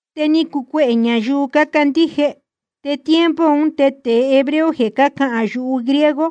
Te ni cucuehē ñayuu cácandíje. Te tiempo un te tēe hebreo jeē cácahān yuhu griego,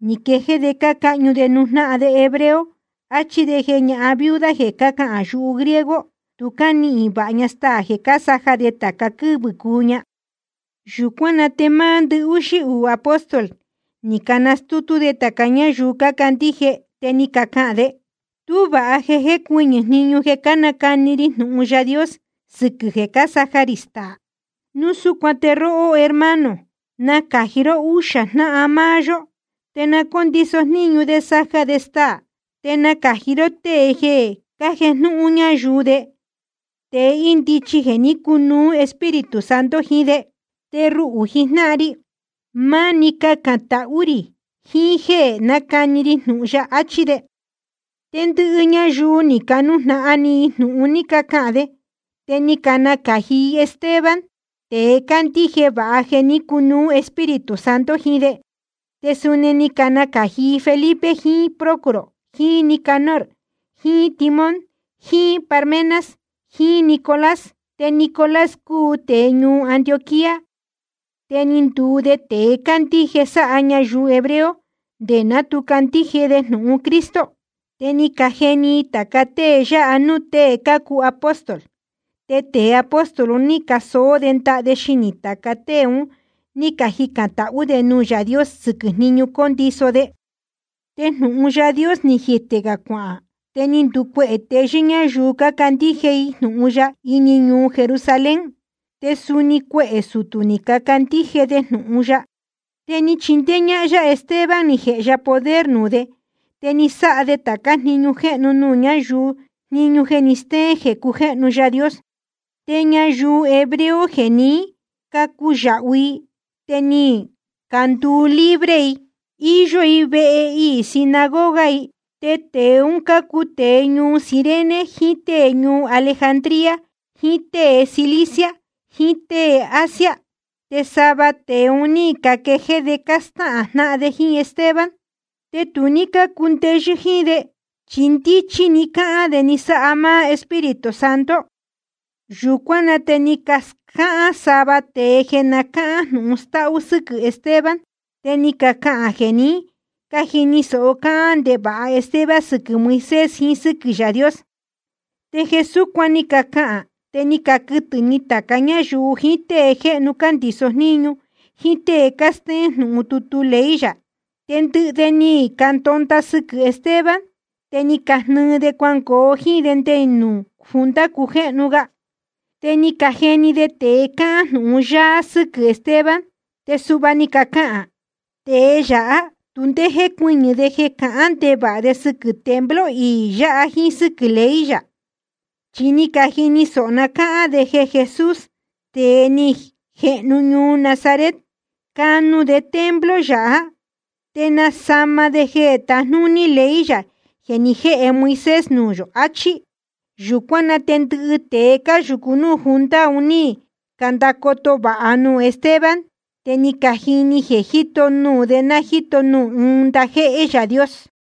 ni quejéé de cácahñu de nuū jnáhan hebreo de, áchí de jeē ñahan viuda jeē cácahān yuhu griego tu cánihīn vāha ña staā jeē cásaja de tāca quɨ́vɨ̄ cuu ña. Yūcuán na te máá ndɨhúxí uū apóstol ni canastútú de tāca ñáyuu cácandíje, te ni cacahān de: Tú vāha jeē jécuɨñɨ̄ jniñu jeē cánacani ri jnūhun Yaā Dios sɨquɨ̄ jeē cásaja rī staā. Núu súcuan te róhó, hermano, nacāji ró úxā jnáhan máá yó, te na cóndiso jníñu de saja de staā. Te nacāji ró tée jeē cájejnúhún ñáyuu de, tēe ndíchí jéē ní cunuú Espíritu Santo jiín de. Te ruhū jijnáhan ri, máni cacān tahú rī jiín jéē nácani ri jnūhun ya, achí de. Te ndɨhɨ ñayuu ni canujnahan ni i jnūhun ni cacahān de. Te ni canacāji i Esteban, tēe cándíje vāha jeē ní cunuú Espíritu Santo jiín de. Te suni ni canacāji i Felipe jiín Prócoro jiín Nicanor jiín Timón jiín Parmenas jiín Nicolás. Te Nicolás cúu tēe ñuu Antioquía, te ni nduu de tēe cándíje sahān ñayuu hebreo nde ná tu candíje de jnūhun Cristo. Te ni cajeni i tāca tée yáha núū tée cácuu apóstol, te tēe apóstol un ní casoó de ndaha de xinī tāca tée un ní cajicān tahú de nuū Yaā Dios sɨquɨ̄ jníñu condiso de. Te jnūhun Yaā Dios ni jitē gā cuahān, te ni nducuehē teyɨ́ ñáyuu cácandíje i jnūhun ya ini ñuu Jerusalén. Te suni cuehē sutū ni cacandíje de jnūhun ya. Te ni chindéé ñáhán yá Esteban ni jēhe ya poder nuū de, te ni sáha de tācá jniñu jéhnu nuū ñáyuu, jniñu jeē steén jeē cujéhnu Yaā Dios. Te ñayuu hebreo jeē ní cacuyāhu i te ni canduu libre i, íyó vehe iī sinagoga i. Te tēe un cácuu tēe ñuu Cirene jiín tée ñuu Alejandría jiín tée Cilicia jiín tée Asia. Te sava tēe un ní caquejéé de cástáhān jnáhan de jíín Esteban. Te tu ní cácundeyɨ́ jíín de, chi ndíchí ní cahān de ni sáha máá Espíritu Santo. Yūcuán na te ni cascáhán sava tēe jeē na cáhán jnūhun stáhú sɨ́quɨ̄ Esteban. Te ni cacahān jeē ní cajini sōho cáhán ndevāha Esteban sɨquɨ̄ Moisés jiín sɨ́quɨ̄ Yaā Dios. Te jeē súcuan ni cacahān te ni caquɨtɨ̄ ni tāca ñáyuu jiín tée jéhnu cándīso jníñu jíín tée cástéén jnūhun tutu ley yā. Te ndɨhɨ de ni candonda sɨquɨ̄ Esteban, te ni cajnɨɨ de cuangoo jíín de nde nuū junta cujéhnu ga. Te ni cajeni de tēe cahān jnūhun yáá sɨ́quɨ̄ Esteban, te suhva ni cacahān: Tēe yáha tu ndé jécuɨñɨ̄ de jeē cahán ndevāha de sɨquɨ̄ templo iī yáha jíín sɨ́quɨ̄ ley yā. Chi ni cajini sōho ná cáhán de jeē Jesús, tēe ni jehnu ñuu Nazaret, canu de templo yáha te nasama de jeē tajnúní ley yā jeē ni jéhe Moisés nuū yō, áchí. Yūcuán na te ndɨhɨ tēe cáyūcu núū junta un ní candacoto vāha nuū Esteban, te ni cajini jeē jíto nuū de ná jíto nuū ɨɨn ndajéhé Yaā Dios.